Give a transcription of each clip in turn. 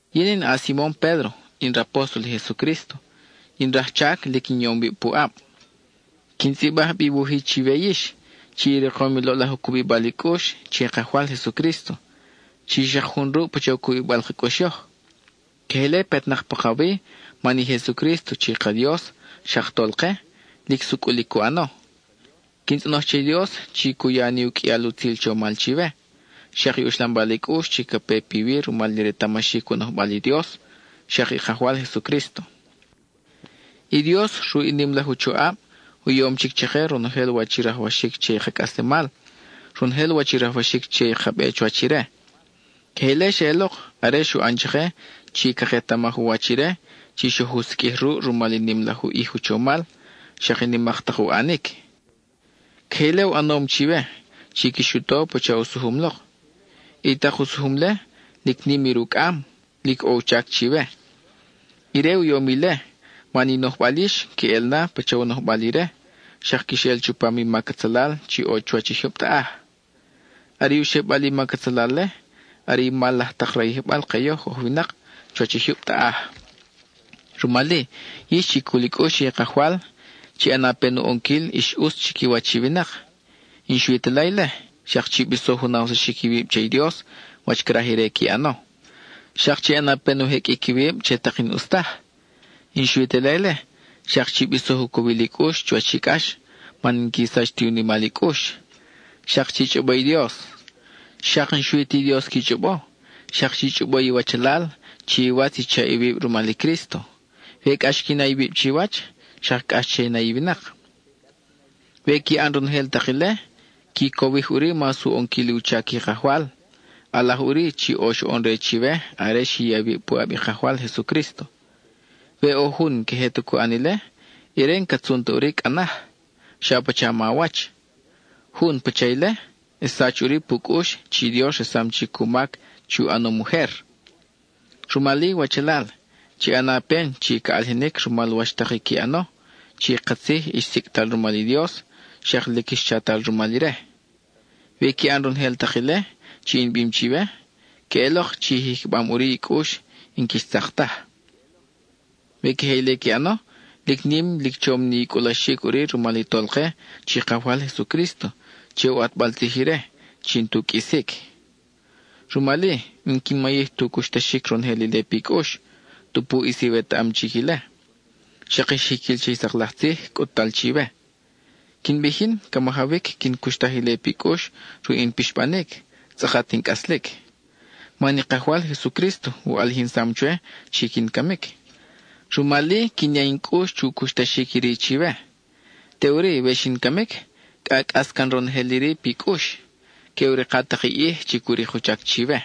Yin in a-Simon Pédro, in rapóstol i Jesucrísto, in rajchac lic in yom wib puʼab. Quin tzʼibaj bi i wuj-i chiwe yix chi i rikom i loʼlaj u cubibal i cʼux che i Kajwal Jesucrísto, chi xak jun ruʼ pacha u cubibal ka cʼux yoj. Queje ile petnak pakawi man i Jesucrísto chi ka Dios, xak Tolke, lic sucʼul i cu ʼano. Quin tzʼonoj che i Dios chi cu ya ni u qʼuial utzil chomal chiwe, xak i uxlambal i cʼux chi ca pe piwi rumal i retamaxic u nojbal i Dios, xak i Kajwal Jesucrísto. I Dios, ruʼ i nim laj u choʼab, u yom chic chake ronojel wach i rajwaxic che i ka cʼaslemal, ronojel wach i rajwaxic che i ka be chuwach ire. Queje ile xeʼelok are xu ʼan chake chi caketamaj u wach ire chi xoj u siqʼuij ruʼ rumal i nim laj u ʼij u chomal, xak i nimak tak u ʼanic. Queje ile u ʼanom chiwe, chi quix u to pacha u sujum lok. I tak u sujum-le, lic nim i rucʼam, lic ʼo u chac chiwe. Ire u yom ile, man i nojbal yix queʼel na pacha u nojbal ire xak quix ʼel chupam i mac atzalal chi ʼo chuwach i jyub taʼaj. Are u xebal i mac atzalal-le are i mal laj tak rayijbal ke yoj oj winak chuwach i jyub taʼaj. Rumal-i, yix chi cul i cʼux che i Kajwal, chi ʼana pen u ʼonquil ix ʼutz chiquiwach i winak; y n-xui ta ile, xak chi bisoj u nawsaxic iwib che i Dios, wach craj ire qui ʼano; xak chi ʼana pen u jeqʼuic iwib che tak i n-ʼus taj; y n-xui ta ile, xak chi bisoj u cowil i cʼux chuwach i cʼax, man n-qui sach tu nimal i cʼux; xak chi chʼobo i Dios. Xak n-xui ti Dios qui chʼobo, xak chi chʼobo iwachalal, chi iwatz i chaʼ iwib rumal i Crísto. We cʼax qui na iwib chiwach, xak cʼax che i na i winak. We qui ʼan ronojel tak ile, qui cowij ʼuri mas u ʼonquil i u chac i kajwal, ʼalaj ʼuri chi ʼo xoʼon re chiwe are xi ya iwib puʼab i Kajwal Jesucrísto. We ʼo jun n-queje ta cu ʼan ile, ire n-ca tzun ta ʼuri cʼa naj, xa pacha mawach. Jun pacha ile, xsach ʼuri pu cʼux chi i Dios resam chic u mac chi u ʼanom ujer. Rumal-i wachalal, chi ʼana pen chi ca ʼalijinic rumal wach tak i qui ʼano, chi katzij ix sicʼtal rumal i Dios xak lic ix chatal rumal ire. We qui ʼan ronojel tak ile chi in bim chiwe, queʼelok chi i jicham ʼuri i cʼux y n-quix tzak taj. We queje ile qui ʼano, lic nim lic chom ni i cʼulaxic ʼuri rumal i Tolke chi Kajwal Jesucrísto, che u ʼatbal tzij ire chi n-tu qʼuisic. Rumal-i, n-quin mayij tu cuxtaxic ronojel ile pi cʼux, tupu ʼis iwetaʼam chic ile, xak ix jiquil che i sak laj tzij cʼut-tal chiwe. Quin bij yin, ca majawic quin cuxtaj ile pi cʼux ruʼ in pixbanic, tzʼakat in cʼaslic. Man i Kajwal Jesucrísto u ʼalijinsam chwe chi quin camic. Rumal-i quin ya in cʼux chu cuxtaxic iri chiwe. Teʼuri, we xin camic, cʼa cʼas can ronojel iri pi cʼux, que u rika tak i ʼij, chi cu rik u chac chiwe.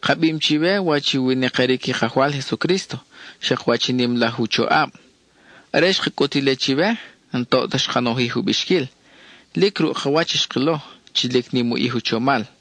Ka bim chiwe wach i u winakiric i Kajwal Jesucrísto, xak wach i nim laj u choʼab. Are xka cʼut ile chiwe, n-toʼ ta xka nojij u bixquil; lic ruʼ ka wach xkilo chi lic nim u ʼij u chomal.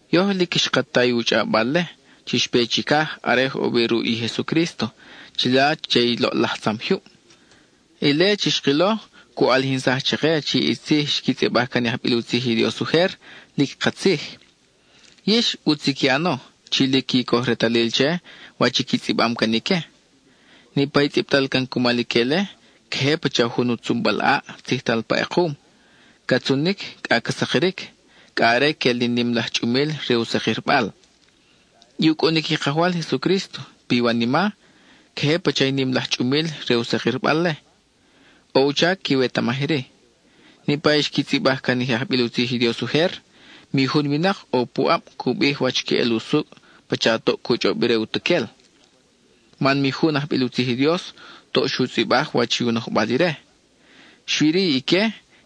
Yoj lic xka ta i u chʼawbal-le chi xpe chicaj are oj ʼo wi ruʼ i Jesucrísto chila che i loʼlaj tzam jyub. Ile chi xkilo cu ʼalijinsaj chake chi i tzij xqui tzʼibaj can i ajbil u tzij i Dios ujer, lic katzij. Yix, ʼutz i qui ʼano chi lic qui coj retalil che wach i qui tzʼibam can ique. Niʼpa i tzʼibtal can cumal ique-le queje pacha jun u tzunbal ʼaʼ tzijtal pa ʼekum, ca tzunic cʼa ca sakiric, cʼa are quel li nim laj chʼumil re u sakirbal. I u cʼunic i Kajwal Jesucrísto piwanima, queje pacha i nim laj chʼumil re u sa-kirbal-le. ʼO u chac quiwetamaj iri: niʼpa i xqui tzʼibaj can i je ajbil u tzij i Dios ujer, mi jun winak ʼo puʼab cu bij wach queʼel usucʼ pacha toʼ cu chʼob ire utuquel. Man mi jun ajbil u tzij i Dios toʼ xu tzʼibaj wach i u nojbal ire. Xui-ri ique,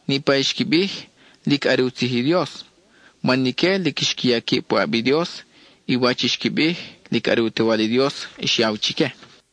niʼpa i xqui bij, lic are u tzij i Dios, man ique lic xqui ya quib puʼab i Dios, y wach i xqui bij, lic are u Tewal i Dios xyaw chique.